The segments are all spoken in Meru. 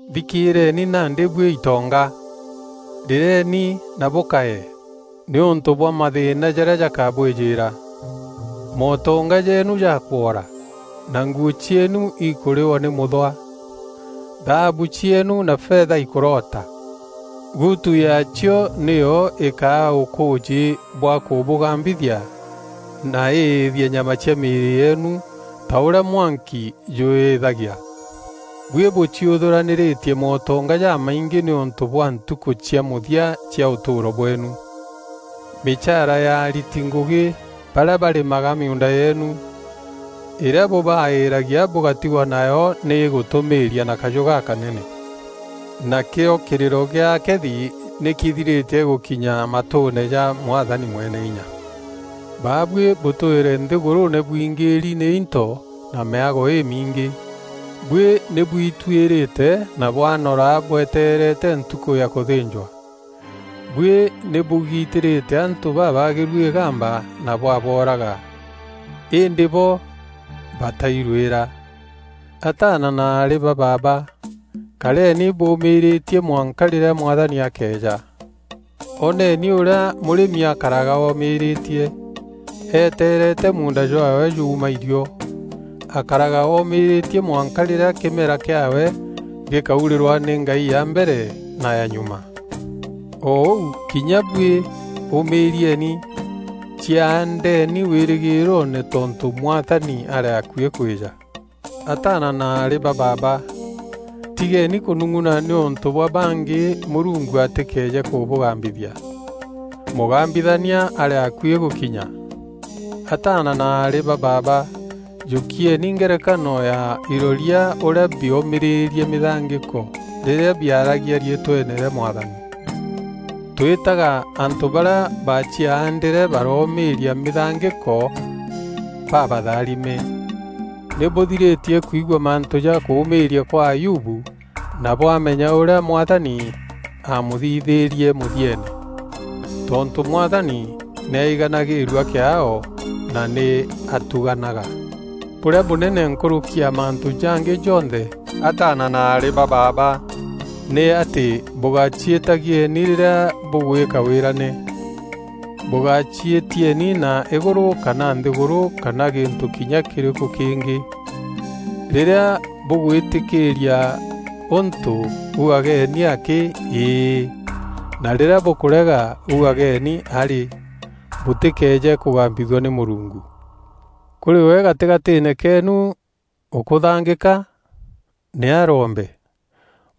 Nthikîîreeni nandî buî itonga! Rîreni na bûkaye, nîûntû bwa mathîîna jarîa jakabwîjîîra. Mootonga jeenu jakwora, na nguû cieenu ikûrîwa nî mûthwa. Thaabu cieenu na fetha ikûrota. Gutu yaacio nîyo îkaa ûkûûjî bwa kûbûgambithia na îîthie nyama cia mîîrî yeenu ta ûrîa mwanki jûîîthagia. Buî bûciûthûranîrîtie mootonga jamaingî nîûntû bwa ntûku cia mûthia cia ûtûûro bweenu. Mîchaara ya ariti ngûgî barîa barîmaga miuunda yeenu, îrîa bûbaîîragia bûgatigwa nayo nî îgûtûmîîria na kajû gakanene. Nakîo kîrîro gîa akethi nî kîthirîtie gûkinya matûûne ja Mwathani Mweneinya. Babuî bûtwîre nthîgûrûûne bwingîîri nî into na mîago îmingî. Buî nî bwituîrîte na bwanora bwetereete ntukû ya kûthînjwa. Buî nî bûgitîrîte antû babaagîru îgamba na bwabooraga. Îndî bo batairûîra. Ataana na aarî ba baaba, kareni bûûmîîrîtie mwanka rîrîa Mwathani akeeja. Oneni ûrîa mûrîmi akaraga oomîrîtie, eteerete muunda jwaawe juuma irio. Akaraga oomîîrîtie mwanka rîrîa kîmera kîaawe gîkaurîrwa nî ngai ya mbere na ya nyuma. O ûu kinya buî ûmîîrieni. Ciaandeni wîrîgîîroone tontû Mwathani arî akuî kwîja. Ataana na aarî ba baaba, tigeeni kûnung'una nîûntû bwa bangî Mûrungu atîkeeje kûbûgambithia. Mûgambithania arî akuî gûkinya. Ataana na aarî ba baaba, jûkieni ngerekano ya iroria ûrîa biomîrîrie mîthangîko rîrîa biaaragia riîtweene rîa Mwathani. Twîtaga antû barîa baciaandîre baroomîîria mîthangîko babatharime. Nî bûthirîtie kwigua mantû ja kûûmîîria kwa Ayubu na bwamenya ûrîa Mwathani amûthithîîrie mûthieene. Tontû Mwathani nî aiganagîîrua kîaao na nî atuganaga. Bûrîa bûnene nkûrûki ya mantû jangî jonthe, ataana na aarî ba baaba nî atî bûgaciîtagieni rîrîa bûgwîka wîrane. Bûgaciîtieni na îgûrû kana nthîgûrû kana gîntû kinya kîrîkû kîngî. Rîrîa bûgwîtîkîîria ûntû ugageni akî “Ii”, na rîrîa bûkûrega ugageni, “arî”, bûtîkeeje kûgambithua nî Mûrungu. Kûrî we gatîgatîîne keenu ûkûthangîka? Nî arombe.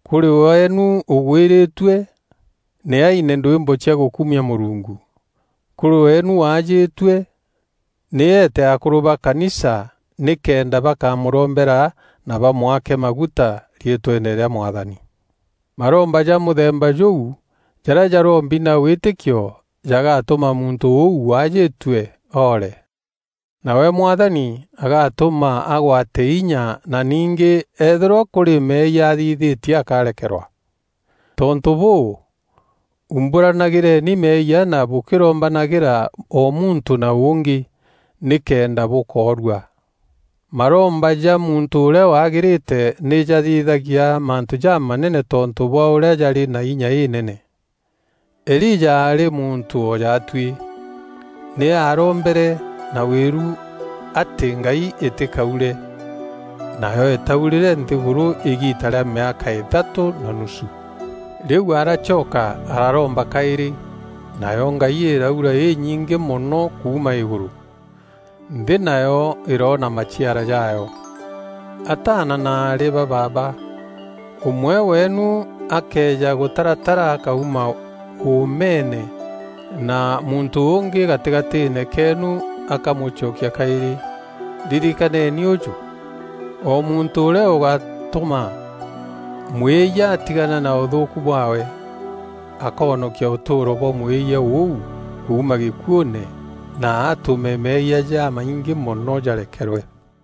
Kûrî weenu ûgwîrîtue? Nî aine ndwîmbo cia gûkumia Mûrungu. Kûrî weenu waajîtue? Nî eete akûrû ba kanisa, nîkenda bakamûrombera na bamwake maguta riîtweene rîa Mwathani. Maromba ja mûthemba jûu jarîa jarombi na wîtîkio jagatûma muntû ûu waajîtue oore. Nawe Mwathani agatûma agwate inya na ningî eethîrwa kûrî meeyia athithîtie akarekerwa. Tontû bûû, umbûranagîreni meeyia na bûkîrombanagîra o muntû na ûngî, nîkenda bûkoorua. Maromba ja muntû ûrîa wagîrîte nî jathithagia mantû jamanene tontû bwa ûrîa jarî na inya înene. Elija aarî muntû o jaatuî. Nî aarombere na wîru atî ngai îtîkaure, nayo îtaurîre nthîgûrû îgiita rîa mîaka îthatû na nusu. Rîu aracoka araromba kaîrî, nayo ngai îraura înyingî mono kuuma îgûrû. Nthî nayo îroona maciara jaayo. Ataana na aarî ba baaba, ûmwe weenu akëeja gûtaratara akauma ûûmeene na muntû ûngî gatîgatîîne keenu akamûcokia kaîrî, ririkaneni ûjû: o muntû ûrîa ûgatûma mwîyia atigane na ûthûûku bwaawe, akoonokia ûtûûro bwa mwîyia ûu kuuma gîkuûne na atûme meeyia jamaingî mono jarekerwe.